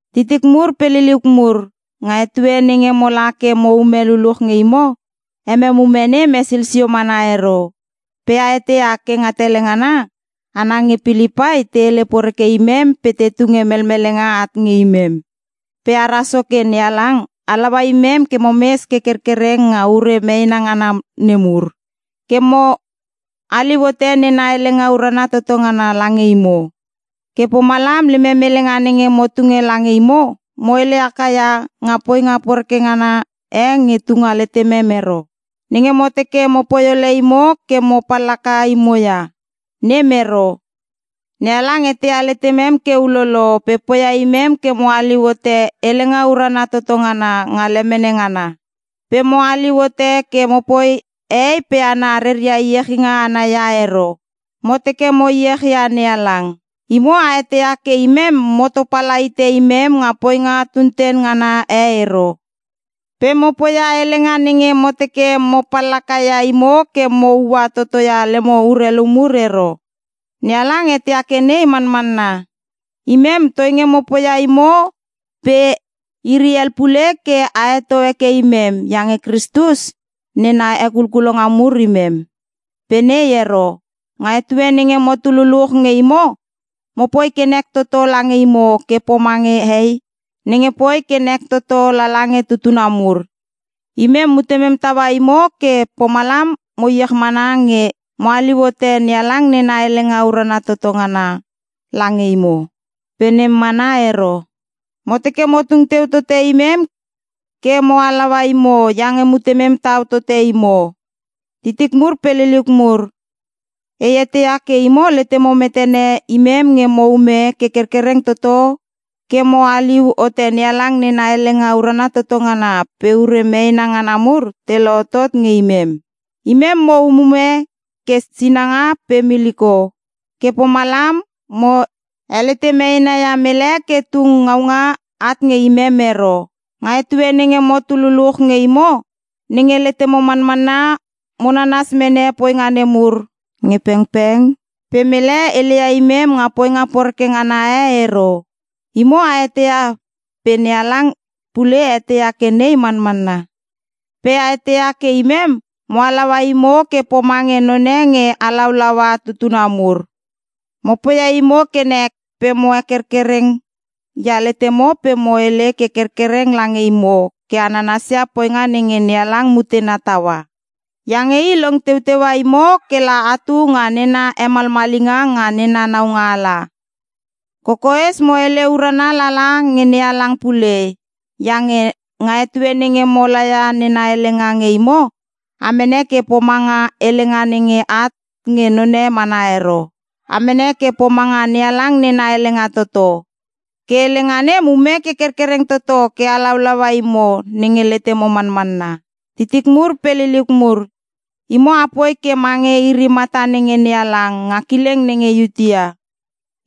Titik mur pe liliuk mur, nga etue nenge mola ke mo ume luluch nge imo, emem ume nem hesil sio mana ero. Pe a eteia ke nga tele ngana, hana nge Pilipai te hele poreke imem pe te tunge melmelenga at nge imem. Pe ara Soke NeHalang halaua imem ke momes ke kerkereng nga ure meena ngana nemur, ke mo haliu hote nena helenga urana toto ngana lange imo. Ke pomalam lemem helenga nenge mo tunge lange imo, mo hele haka ia nga poinga poreke ngana e nge tunga letemem ero; Nenge mo teke mopoi ole imo ke mo pallaka imo ia. Nem ero. NeHalang eteia letemem ke ulolo pe poia imem ke mo haliu hote helenga urana toto ngana nga lemene ngana. Pe mo haliu hote ke mopoi hehei pe hana reria iechinga ana ia ero, mo teke mo e iechia NeHalang. Imo a eteia ke imem mo topala hite imem nga poinga tunten ngana e ero, pe mo poia helenga nenge mo teke mo pallaka ia imo ke mo ua totoia lemo urelu mur ero. NeHalang eteia ke nei manmanna. Imem toinge mo poia imo pe iri hel pule ke a heto heke imem, iange Kristus nena hekulkulonga mur imem. Pe nei ero. Nga etue nenge motu luluch nge imo mopoi ke nek toto lange imo ke pomange hei nenge poi ke nek toto lala nge tutuna mur. Imem mutemem taua imo ke pomalam mo iech mana nge mo haliu hote NeHalang nena helenga urana toto ngana lange imo. Pe nem mana ero. Mo teke mo tung teu tote imem ke mo halaua imo iange mutemem tau tote imo. Titik mur pe liliuk mur, e eteia ke imo letemo metene imem nge mo ume ke kerkereng toto ke mo haliu hote NeHalang nena helenga urana toto ngana pe ure meena ngana mur te lohotot nge imem. Imem mo umume ke sinanga pe miliko ke pomalam mo helete meena ia mele ke tung ngaunga at nge imem ero. Nga etue nenge motu luluch nge imo nenge letemo manmanna mo nanas mene poinga nemur nge pengpeng pe mele heleia imem nga poinga poreke ngana e ero. Imo a eteia pe NeHalang pule eteia ke nei manmanna. Pe a eteia ke imem mo halaua imo ke pomange none nge halaulaua tutuna mur. Mo poia imo ke nek pe mo hekerkereng ia letemo pe mo hele ke kerkereng lange imo ke a nanasia poinga nenge NeHalang mutena taua. Iange i long teuteua imo kela atu nga nena hemalmalinga nga nena naualanga. Kokoes mo hele urana lala nge NeHalang pule iange nga etue nenge mo laia nena helenga nge imo, a mene ke pomanga helenga nenge at nge none mana ero. A mene ke pomanga NeHalang nena helenga toto. Ke helenga nem ume ke kerkereng toto ke halaulaua imo nenge letemo manmanna. Titik mur pe liliuk mur, imo apoi ke mange iri mata nenge NeHalang nga kileng nenge Iutea.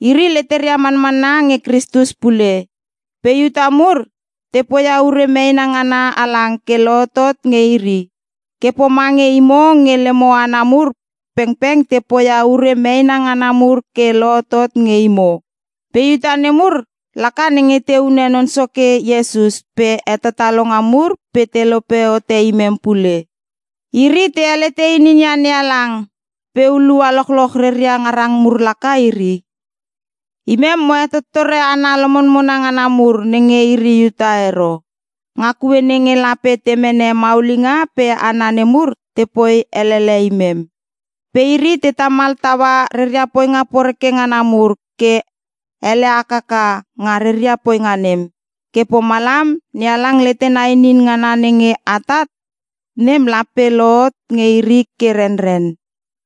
Iri leteria manmanna nge Kristus pule. Pe Iuta mur te poia ure meena ngana halang ke lohotot nge iri, ke pomange imo nge lemo hana mur pengpeng te poia ure meena ngana mur ke lohotot nge imo. Pe Iuta nemur laka nenge te hune Non Soke Iesus pe hetatalonga mur pe te lope hote imem pule. Iri te helete ininia NeHalang, pe hulua lochloch reria ngarang mur laka iri. Imem, mo hetottore hana lomonmona ngana mur nenge iri Iuta ero, nga kue nenge lape te mene maulinga pe hana nemur tepoi elele imem. Pe iri te tamal taua reria poinga poreke ngana mur ke ele hakaka nga reria poinga nem. Ke pomalam NeHalang letena inin ngana nenge atat nem, lape lohot nge iri ke renren.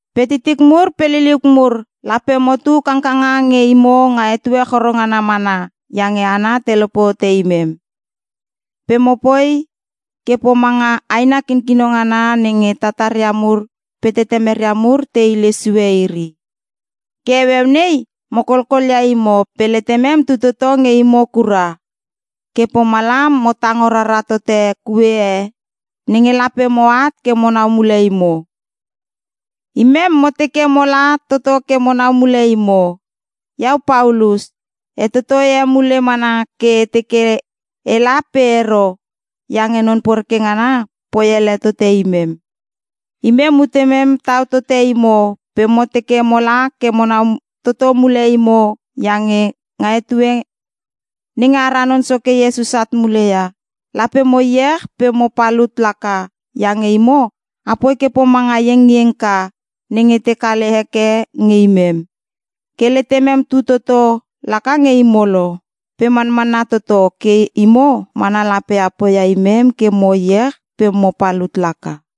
Pe titik mur pe liliuk mur, lape motu kangkanga nge imo nga etue choro ngana mana iange hana te lope hote imem. (Pe mopoi ke pomanga aina kikino ngana nenge tataria mur pe tetemeria mur te hile sue iri.) Ke heueu nei mo kolkol ia imo pe letemem tu toto nge imo kura. Ke pomalam mo tango rara toto kue e nenge lape moat ke monau mule imo. Imem mo teke mola toto ke monau mule imo. Iau Paulus, e totoi emule mana ke e teke ela pe ero iange Non poreke ngana poi ele tote imem. Imem mutemem tau tote imo pe mo teke mola ke monau toto mule imo iange nga etue nenge ara Non Soke Iesus at muleia, lape mo iech pe mo palut laka iange imo apoi ke pomanga iengiengka nenge te kale heke nge imem. Ke letemem tu toto laka nge imo lo. Pe manmanna toto ke imo mana lape a poia imem ke mo iech pe mo palut laka.